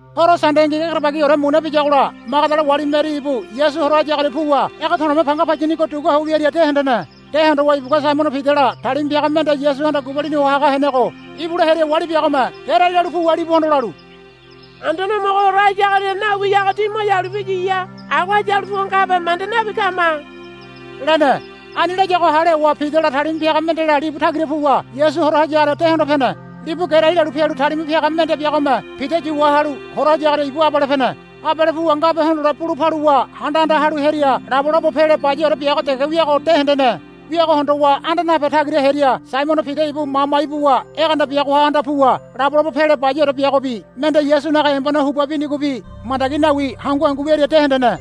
Horo Sandengi egerebagiore muna biyagola Magadala wali Meri ibu Yasu hora hayagoria puwa ege to̱le̱me panga payinigo dugua ho wiaria de hendene. De hondowa ibugua Saimono Pidala talima piaga mende Yasuhanda gubalini ho haga henego ibula hearia wali biagome gerai lalu puwa libuhondo lalu, Anduane Homogo hora hayagoria nawiyago ti mo yalu piyiya. Agoha yalu puwa ngabe manda nabi kama, lene. Ani layago hale howa Pidala talima piaga mendela libu tagira puwa Yasu hora hayagoria de hondo pene. Libu gerai lalu pialu talima piaga mende biagome Pida yu wahalu hora hayagoria ibu abale pene. Abale puwa ngabe hondole bulu paluwa handa anda halu hearia labolabo pele bayaore biago dege wiago de hendene. Wiago hondowa anda nape tagira hearia Saimono Pida ibu mama ibuwa egeanda biagoha anda puwa labolabo pele bayaore biagobi mende Yasunaga embone huba binigobi mandagi nawi hangu hangu wiaria de hendene.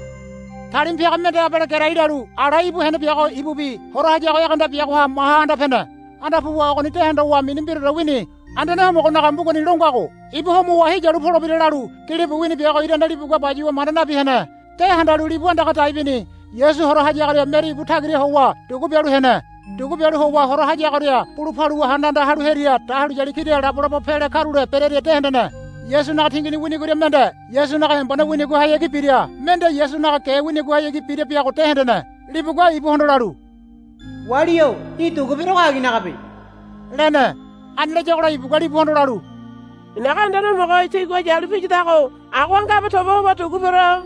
Talima piaga mende abale gerai lalu ala íbu hene biago ibubi hora hayago egeanda biagoha maha anda pene. Anda puwa ogoni de hondowa mini mbiraore wini. Anduane Homogonaga mbugani lo ngago, Ibu homowa heyalu polebira, lalu gilibu wini biago irane libugua bayuwa manda nabi hene. De handalu libu andaga dai bini. Yasu hora hayagoria Meri ibu tagira howa dugu bialu hene. Dugu bialu howa hora hayagoria bulu paluwa handa anda halu hearia dahuliyali kira labolabo pele karule berearia de hendene. Yasunaga tingini winigoria mende Yasunaga embone winigohayagi bira mende Yasunaga ge winigohayagi bira biago de hendene. Libugua ibuhondo lalu, Wali-o í̠ dugu berego aginagabe, lene. Ani layagola ibugua libuhondo lalu, I̱naga Anduane Homogo tigua yalu piyadago agoha ngabe toba howa dugu bero,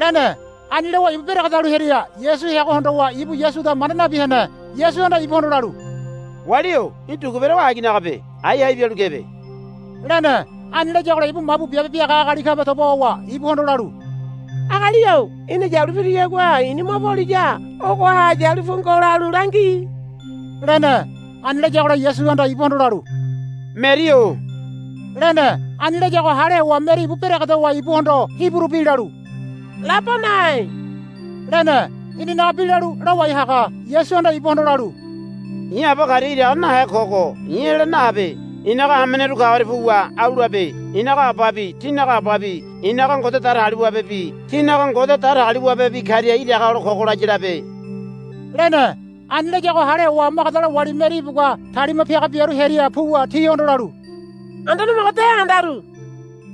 lene. Ani lowa ibu beregedalu hearia Yasu heago hondowa ibu Yasuda manda nabi hene. Yasuhanda ibuhondo lalu, Wali-o í̠ dugu berego aginagabe. Ái hai bialu kebe, lene. Ani layagola ibu mabu biabe biaga agali kabe toba howa ibuhondo lalu, Agali-o í̠na yalu piriyagua i̱ni mo poliya ogoha yalu pu ngo lalu langi, lene. Ani layagola Yasuhanda ibuhondo lalu, Meri-o, lene. Ani layago hale howa Meri ibu beregedowa ibuhondo Hiburu bi lalu, Labonai, lene. Inanaga bi lalu, Lawai haga. Yasuhanda ibuhondo lalu, I̱ Aba karia iraga nahe kogo i̱ ela nahabe. I̱naga hameneru kagoria puwa au labe. I̱naga Ababi tínaga Ababi i̱naga Ngode Datagaliwabebi tínaga Ngode Datagaliwabebi karia iraga hole kogo laya labe, lene. Ani layago hale howa Magadala wali Meri ibugua talima piaga biaru hearia puwa tihondo lalu, Anduane Homogo de handaru,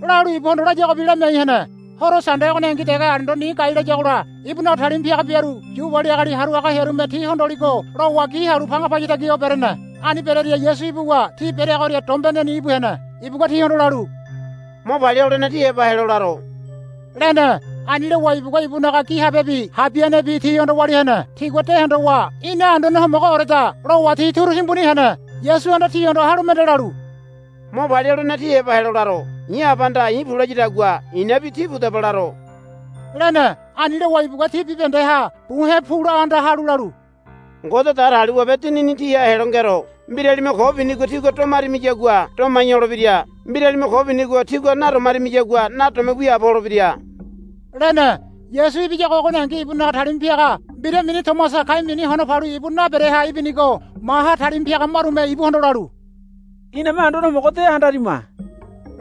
lalu ibuhondo layagobi lamiai hene. Horo Sande ogoningi dege alendo ni gai layagola ibunaga talima piaga biaru Yu wali agali haru haga hearume ti hondoligo lowa gi halu panga paya tagi ho berene. Ani berearia Yasu ibuwa ti bereagoria dombeneni íbu hene. Ibugua tihondo lalu, Mo palia holene tí heba helo laro, lene. Ani lowa ibugua ibunaga gi habebi habianebi tihondo walia hene. Tigua de hondowa, Ina Anduane Homogooreda, lowa ti turu timbuni hene. Yasuhanda tihondo halu mende lalu, Mo palia holene tí heba helo laro. I̱ Abahanda i̱ pu layadagua i̱nabi tí pudaba laro, lene. Ani lowa ibugua ti bibahendeha buhe̱ pu la anda halu lalu, Ngode Datagaliwabe Dinini tíha helo ngero. Mbiralime ko binigo tígua domarimiyagua domai holebira. Mbiralime ko binigo tígua nadomarimiyagua nadome wiaabo holebira, lene. Yasu ibiyago ogoningi ibunaga talima piaga mbira mini Tomasa kai mini Hono Palu ibu nabereha ibinigo maha talima piaga marume ibuhondo lalu, Iname Anduane Homogo de handarima,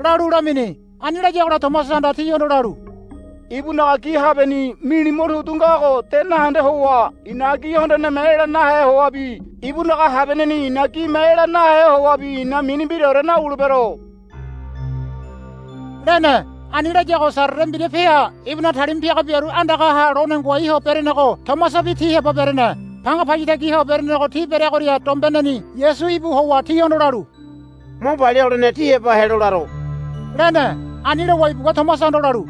lalu lamini. Ani layagola Tomasahanda tihondo lalu, Ibunaga gi habeni nili motudu ngago de nahende howa i̱naga gi hondoneme ela nahe howabi ibunaga habianeni i̱naga gime ela nahe howabi i̱na mini mbiraore nawulebero, lene. Ani layago Sarere mbira peha ibunaga talima piaga biaru andagaha lone ngoai ho berenego Tomasabi ti heba berene. Panga paya tagi ho berenego ti bereagoria dombeneni Yasu íbu howa tihondo lalu, Mo palia holene tí heba helo laro, lene. Ani lowa ibugua Tomasahondo lalu,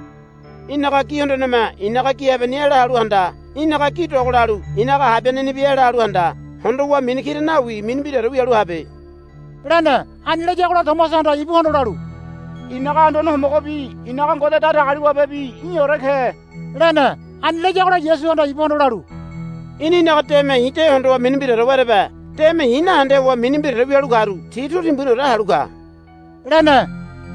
Í̠naga gi hondoneme i̱naga gi habeni ela halu handa. Í̠naga gi dogolalu i̱naga habianenibi ela halu handa. Hondowa mini kira nawi mini mbiraore wialu habe, lene. Ani layagola Tomasahanda ibuhondo lalu, I̱naga Anduane Homogobi i̱naga Ngode Datagaliwabebi í̠ore ke, lene. Ani layagola Yasuhanda ibuhondo lalu, Í̠na í̠naga deme i̱ de hondowa mini mbiraore werebe. Deme i̱ nahende howa mini mbiraore wialu karu ti turu timbuniore halu ka, lene.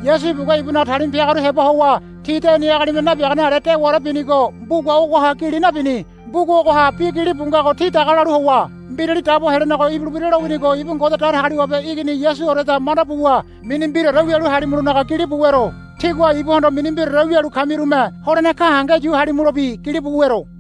Yasu ibugua ibunaga talima piagaru heba howa ti deni agalime nabiagane ale dewaore binigo mbuga ogoha gili nabini. Mbuga ogoha bi gilibu ngago tí daga lalu howa Mbirali Dabo Helenego ibulebira lowinigo ibu Ngode Datagaliwabe Igini Yasuoreda manda buwa mini mbiraore wialu halimulonaga gilibu wero. Tígua ibuhondo mini mbiraore wialu kamirume holene gahenge yu halimulobi gilibu wero.